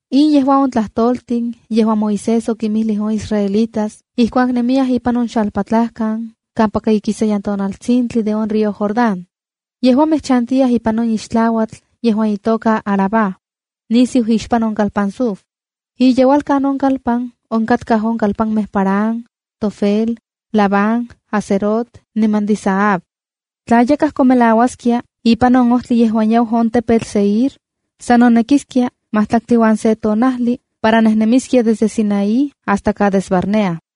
In yejua on tlajtoltin yejuan Moisés okinmijlij on israelitas ijkuak nemiyaj ipan on xalpatlajkan, kampaka ikisayan tonaltsintli de on río Jordán. Yejuamej chantiyaj ipan on ixtlauatl yejuan itoka Arabá, nisiu ixpan on kalpan Suf. Iyeualkan on kalpan onkatkaj on kalpanmej Parán, Tofel, Labán, Hazerot niman Dizahab. Tla yakaj komelauaskia ipan on ojtli yejuan yau on tepetl Seir, san nonekiskia matlaktli uan se tonajli para nejnemiskia de Sinaí hasta Cades Barnea.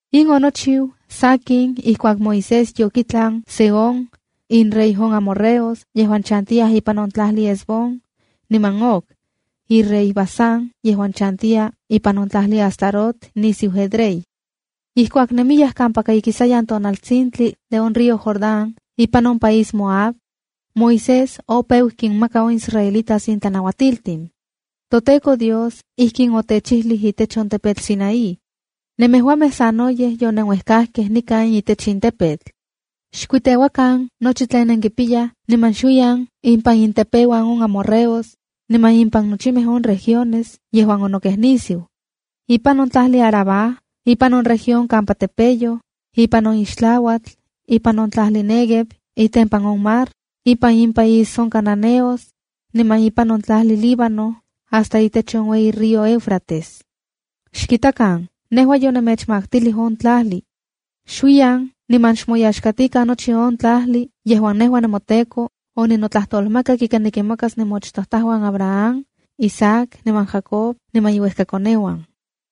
In onochiu, sakin ijkuak Moisés yokitlan Sehón, inrey on amorreos yejuan chantiyaj ipan on tlajli Hesbón, niman Og, irey Basán yejuan chantiya ipan on tlajli Astarot nisiu Edrei. Ijkuak nemiyaj kampaka ikisayan tonaltsintli de on río Jordán ipan on país Moab, Moisés opeu kinmaka on israelitas in tlanauatiltin: “ToTEKO Dios ijkin otechijlij itech on tepetl Sinaí: ‘Nemejuamej sanoyej yonenuejkajkej nikan itech in tepetl. Xkuiteuakan nochi tlen nenkipiyaj niman xuiyan impan intepeuan on amorreos, niman impan nochimej on regiones yejuan onokej nisiu: ipan on tlajli Arabá, ipan on región kampa tepeyoj, ipan on ixtlauatl, ipan on tlajli Néguev itempan on mar, ipan impaís on cananeos, niman ipan on tlajli Líbano, hasta itech on ueyi río Éufrates. Xkitakan, nejua yonemechmaktilij on tlajli. Xuiyan niman xmoyaxkatikan nochi on tlajli yejuan nejua, nemoTEKO, oninotlajtolmakak ika nikinmakas nemoachtojtajuan Abraham, Isaac niman Jacob niman inuejkakoneuan.’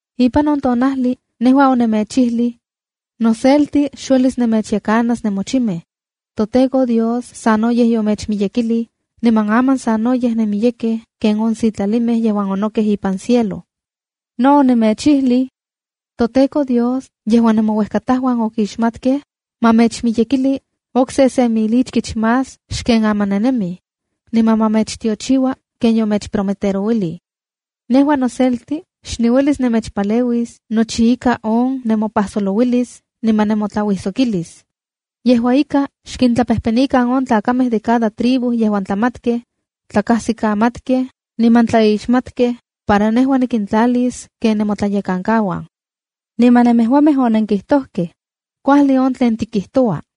’Ipan on tonajli nejua onemechijlij: ‘Noselti xuelis nemechyekanas nemochimej. ToTEKO Dios sanoyej yomechmiyekilij, niman aman sanoyej nenmiyekej ken on sitlalimej yejuan onokej ipan cielo.’ No onemechijlij: ‘¡ToTEKO Dios yejuan nemouejkatajuan okixmatkej, ma mechmiyekili okse se mil ichkich más xken aman nennemij, niman ma mechtiochiua ken yomechprometerouilij!” Nejua noselti xniuelis nemechpaleuis nochi ika on nemopajsolouilis, niman nemotlauijsokilis. Yejua ika, xkintlapejpenikan on tlakamej de cada tribu yejuan tlamatkej, tlakasikamatkej, niman tlaixmatkej, para nejua nikintlalis ken nemotlayekankauan.’ ’Niman nemejuamej onenkijtojkej: ‘Kuajli on tlen tikijtoua.’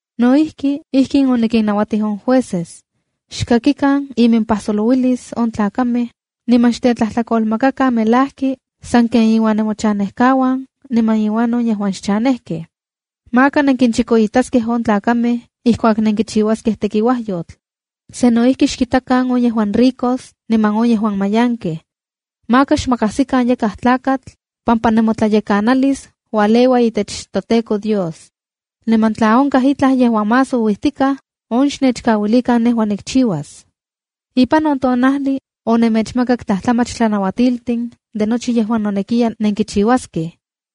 No ijki, ijkin onikinnauatij on jueces: ‘Xkakikan iminpajsolouilis on tlakamej, niman xtetlatlakolmakakan melajki sanken inuan nemochanejkauan niman inuan on yejuan xchanejkej. Maka nenkinchikoitaskej on tlakamej ijkuak nenkichiuaskej tekiuajyotl. Sa no ijki xkintakan on yejuan ricos niman on yejuan mayankej. Maka xmakajsikan yakaj tlakatl, pampa nemotlayekanalis ualeua itech toTEKO Dios. Niman tla onkaj itlaj yejuan más ouijtikaj, on xnechkauilikan nejua nikchiuas.’ ’Ipan on tonajli onemechmakak tlajtlamach tlanauatiltin de nochi yejuan nonekiya nenkichiuaskej.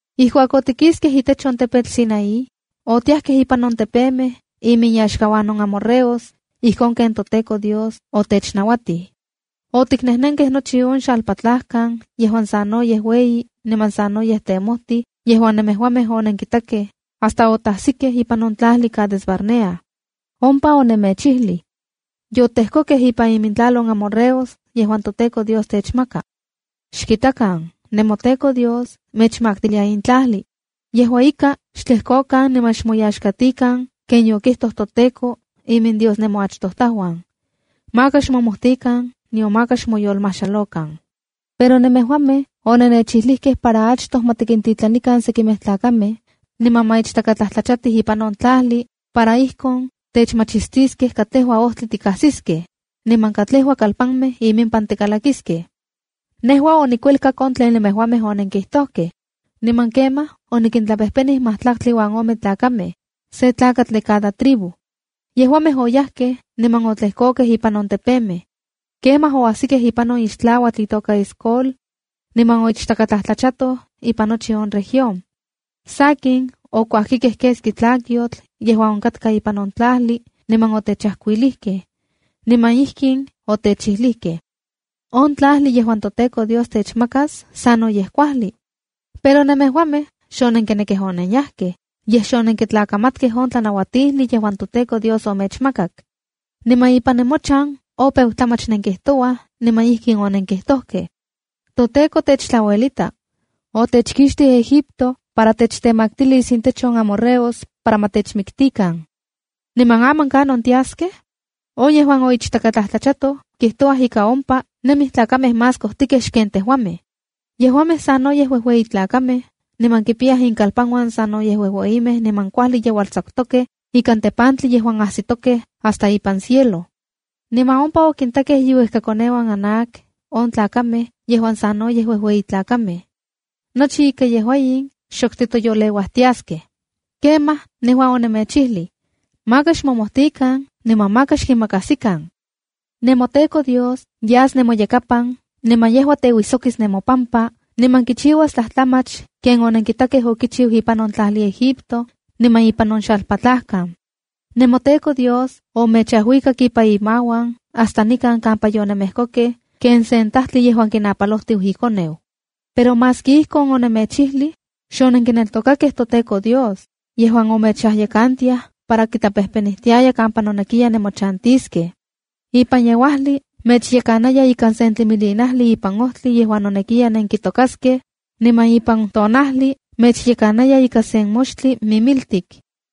’Ijkuak otikiskej itech on tepetl Sinaía, otiajkej ipan on tepemej iminyaxkauan on amorreos, ijkon ken toTEKO Dios otechnauatij. Otiknejnenkej nochi on xalpatlajkan yejuan sanoyej ueyi niman sanoyej temojtij yejuan nemejuamej onenkitakej, hasta otajsikej ipan on tlajli Cades-barnea. Ompa onemechijlij: ‘Yotejkokej ipan imintlal on amorreos yejuan toTEKO Dios techmaka. Xkitakan, nemoTEKO Dios mechmaktilia in tlajli. Yejua ika, xtlejkokan niman xmoyaxkatikan ken yokijtoj toTEKO, iminDios nemoachtojtajuan. Maka xmomojtikan, nion maka xmoyolmajxalokan.’ ’Pero nemejuamej onennechijlijkej para achtoj ma tikintitlanikan sekimej tlakamej, niman ma ichtakatlajtlachatij ipan on tlajli, para ijkon techmachistiskej katlejua ojtli tikajsiskej, niman katlejua kalpanmej iminpan tikalakiskej. Nejua onikuelkak on tlen nemejuamej onenkijtojkej, niman kemaj onikintlapejpenij majtlaktli uan ome tlakamej, se tlakatl de cada tribu. Yejuamej oyajkej niman otlejkokej ipan on tepemej. Kemaj oajsikej ipan on ixtlauatl itoka Escol. Niman oichtakatlajtlachatoj ipan nochi on región. Sakin, okuajkikej keski tlakyotl yejuan onkatka ipan on tlajli, niman otechajkuilijkej. Niman ijkin otechijlijkej: ‘On tlajli yejuan toTEKO Dios techmakas sanoyej kuajli.’ Pero nemejuamej xonenkinekej onenyajkej, yej xonenkitlakamatkej on tlanauatijli yejuan toTEKO Dios omechmakak. Niman ipan nemochan opeu tlamach nenkijtouaj niman ijkin onenkijtojkej: ‘ToTEKO techtlauelita. Otechkixtij Egipto para techtemaktilis intech on amorreos para ma techmiktikan. Niman aman ¿Kanon tiaskej? On yejuan oichtakatlajtlachatoj kijtouaj ika ompa nemij tlakamej más kojtijkej xken tejuamej. Yejuamej sanoyej uejueyitlakamej niman kipiyaj inkalpanuan sanoyej uejueyimej niman kuajli yeualtsakutokej ikan tepantli yejuan ajsitokej hasta ipan cielo. Niman ompa okintakej iuejkakoneuan Anac, on tlakamej yejuan sanoyej uejueyitlakamej. Nochi ika yejua in xok titoyoleuaj tiaskej.’ Kemaj nejua onemechijlij: ‘Maka xmomojtikan niman maka xkinmakajsikan. NemoTEKO Dios yas nemoyakapan, niman yejua teuijsokis nemopampa, niman kichiuas tlajtlamach ken onenkitakej okichiu ipan on tlajli Egipto, niman ipan on xalpatlajkan. NemoTEKO Dios omechajuikak ipan imauan hasta nikan kampa yonemejkokej, ken sen tajtli yejuan kinapalojtiu ikoneu.’ Pero maski ijkon onemechijlij, xonenkineltokakej toTEKO Dios, yejuan mechyekantiaya para kitlapejpenijtiaya kampa nonekiya nemochantiskej. Ipan yeuajli mechyekanaya ikan sen tlimilinajli ipan ojtli yejuan nonekiya nenkitokaskej, niman ipan tonajli mechyekanaya ika sen moxtli mimiltik.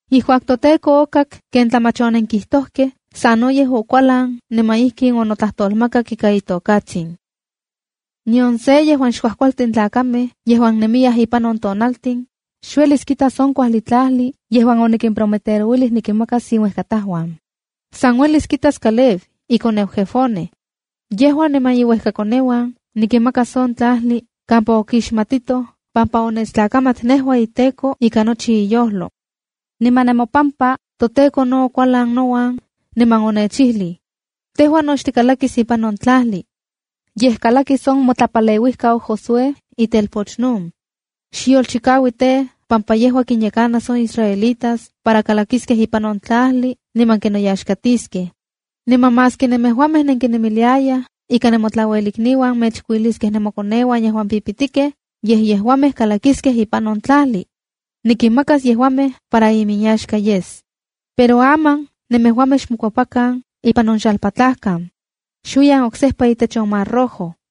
’Ijkuak toTEKO okak ken tlamach onenkijtojkej sanoyej okualan niman ijkin onotlajtolmakak ika itokatsin: ’Nion se yejuan xkuakualtin tlakamej yejuan nemiyaj ipan on tonaltin, xuelis kitas on kuajli tlajli yejuan onikimprometerouilij nikinmakas inuejkatajuan. San uelis kitas Caleb, ikoneu Jefone. Yejua niman iuejkakoneuan nikinmakas on tlajli kampa okixmatitoj pampa onechtlakamat nejua iTEKO ika nochi iyojlo.’ ’Niman nemopampa, toTEKO no okualan nouan, niman onechijlij: ‘Tejua no xtikalakis ipan on tlajli. Yej, kalakis on motlapaleuijkau Josué, itelpoch Nun. Xyolchikau tej, pampa yejua kinyekanas on israelitas para kalakiskej ipan on tlajli niman kinoyaxkatiskej.’ Niman maski nemejuamej nenkinemiliayaj ika nemotlauelikniuan mechkuiliskiaj nemokoneuan yejuan pipitikej, yej yejuamej kalakiskej ipan on tlajli. Nikinmakas yejuamej para iminyaxka yes. Pero aman, nemejuamej xmokuepakan ipan on xalpatlajkan. Xuiyan oksejpa itech on Mar Rojo.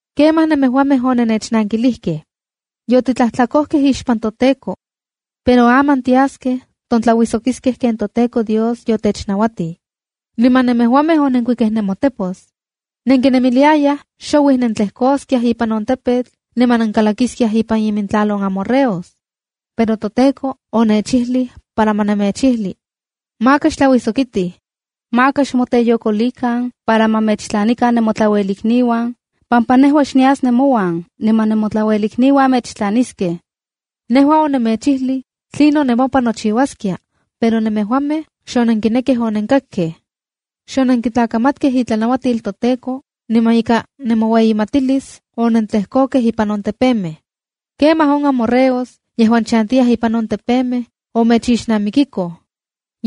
’Kemaj nemejuamej onennechnankilijkej: ‘Yotitlajtlakojkej ixpan toTEKO. Pero aman tiaskej, tontlauijsokiskej ken toTEKO Dios yotechnauatij.’ Niman nemejuamej onenkuikej nemotepos. Nenkinemiliayaj xouij nentlejkoskiaj ipan on tepetl niman nenkalakiskiaj ipan imintlajli on amorreos. Pero toTEKO onechijlij para ma nemechijli: ‘Maka xtlauijsokitij. Maka xmoteyokolikan para ma mechtlanikan nemotlauelikniuan, pampa nejua xnias nemouan niman nemotlauelikniuan mechtlaniskej.’ Nejua onemechijlij tlinon nemopan nochiuaskia, pero nemejuamej xonenkinekkej onennechkakkej. Xonenkitlakamatkej itlanauatil toTEKO, niman ika nemoueyimatilis onentlejkokej ipan on tepemej. Kemaj on amorreos, yejuan chantiyaj ipan on tepemej, omechixnamikikoj.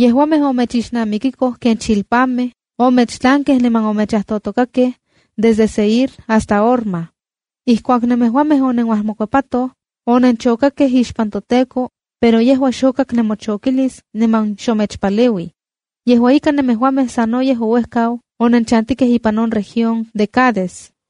Yejuamej omechixnamikikoj ken chilpamej, omechtlankej niman omechajtotokakej, desde Seir hasta Horma. Ijkuak nemejuamej onenuajmokuepatoj, onenchokakej ixpan toTEKO, pero yejua xokak nemochokilis niman xomechpaleuij. Yejua ika, nemejuamej sanoyej ouejkau onenchantikej ipan on región de Cades.